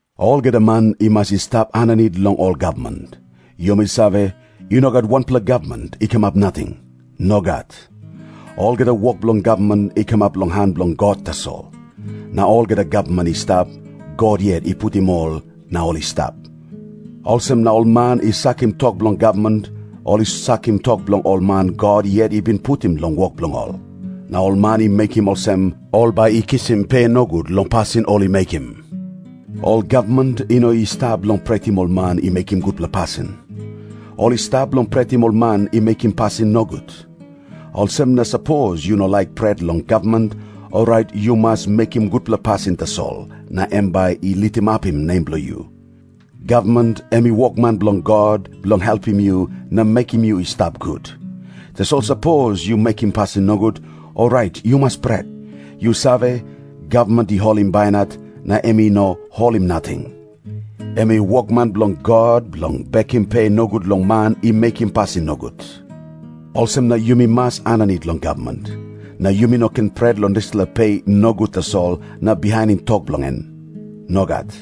Olgeta man i mas i stap aninit long ol gavman. Yumi save, i no gat wanpela gavman i kamap nating. Nogat. Olgeta wok bilong gavman i kamap long han bilong God tasol. Na olgeta gavman i stap, God yet i putim ol na ol i stap. Olsem na ol man i sakim tok bilong gavman, ol i sakim tok bilong ol man God yet i bin putim long wok bilong ol. Na ol man i mekim olsem, ol bai i kisim pe nogut long pasin ol i mekim. Ol gavman i no i stap bilong pretim ol man i mekim gutpela pasin. Ol i stap bilong pretim ol man i mekim pasin nogut. Olsem na sapos yu no laik pret long gavman, orait yu mas mekim gutpela pasin tasol, na em bai i litimapim nem bilong yu. Gavman em i wokman bilong God, bilong helpim yu na mekim yu i stap gut. Tasol sapos yu mekim pasin nogut, orait yu mas pret. Yu save, gavman i holim bainat, na em i no holim nating. Em i wokman bilong God, bilong bekim pe nogut long man i mekim pasin nogut. Olsem na yumi mas aninit long gavman. Na yumi no ken pret long dispela pe nogut tasol na bihainim tok bilong em. Nogat.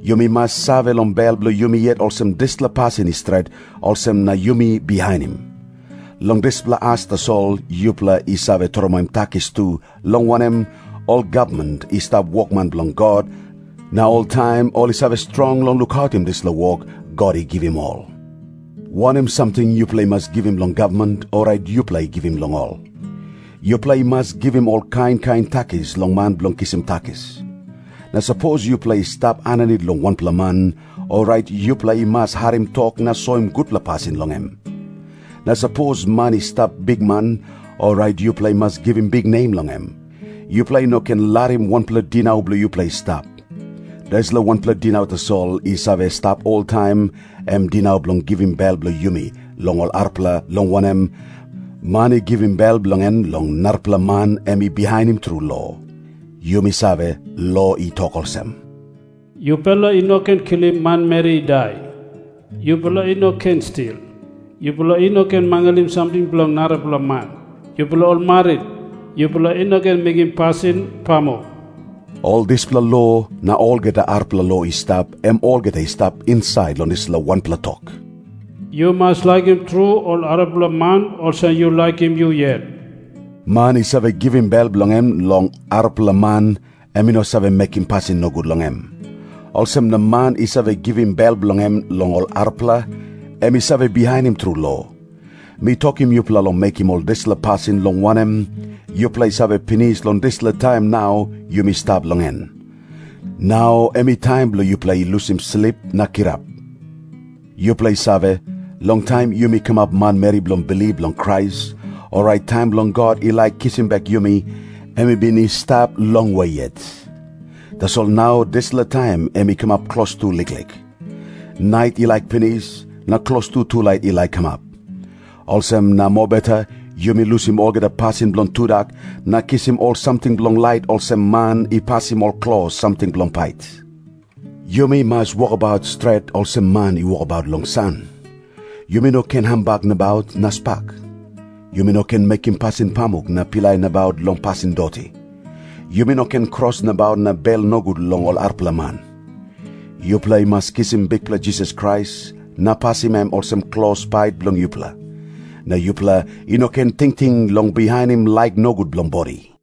Yumi mas save long bel bilong yumi yet olsem dispela pasin i stret, olsem na yumi bihainim. Long dispela as tasol yupela i save tromoi takis tu, long wanem, ol gavman i stap wokman bilong God, na oltaim ol i save strong long lukautim dispela wok God i givim ol. Wanem samting yupela i mas givim long gavman, orait yupela givim long ol. Yupela i mas givim ol kain kain takis long man bilong kisim takis. Na sapos yupela i stap aninit long wanpela man, orait yupela i mas harim tok na soim gutpela pasin long em. Na sapos man i stap bikman, orait yupela i mas givim biknem long em. Yupela i no ken larim wanpela dinau bilong yupela i stap. Dispela wanpela dinau tasol i save stap oltaim, em dinau bilong givim bel bilong yumi long ol arapela, long wanem, man i givim bel bilong em long narapela man em i bihainim tru lo. Yumi save, lo i tok olsem, “Yupela i no ken kilim manmeri i dai. Yupela i no ken stil. Yupela i no ken mangalim samting bilong narapela man. Yupela ol marit, yupela i no ken mekim pasin pamuk.” Ol dispela lo, na olgeta arapela lo i stap, em olgeta i stap insait long dispela wanpela tok, “Yu mas laikim tru ol arapela man olsem yu laikim yu yet.” Man i save givim bel bilong em long arapela man, em i no save mekim pasin nogut long em. Olsem na man i save givim bel bilong em long ol arapela, em i save bihainim tru lo. Mi tokim yupela long mekim ol dispela pasin, long wanem, yupela i save pinis long dispela taim nau yumi stap long en. Nau em i taim bilong yupela i lusim slip na kirap. Yupela i save, long taim yumi kamap manmeri bilong bilip long Krais, orait taim bilong God i laik kisim bek yumi, em i bin i stap longwe yet. Tasol nau dispela taim em i kamap klostu liklik. Nait i laik pinis, na klostu tulait i laik kamap. Olsem na mobeta yumi lusim olgeta pasin bilong tudak, na kisim ol samting bilong lait olsem man i pasim ol klos samting bilong pait. Yumi mas wokabaut stret, olsem man i wokabaut long san. Yumi no ken hambak nabaut na spak. Yumi no ken mekim pasin pamuk na pilai nabaut long pasin doti. Yumi no ken kros nabaut na bel nogut long ol arapela man. Yupela i mas kisim Bikpela Jisas Krais na pasim em olsem klos pait bilong yupela. Na yupela i no ken tingting long bihainim laik nogut bilong bodi.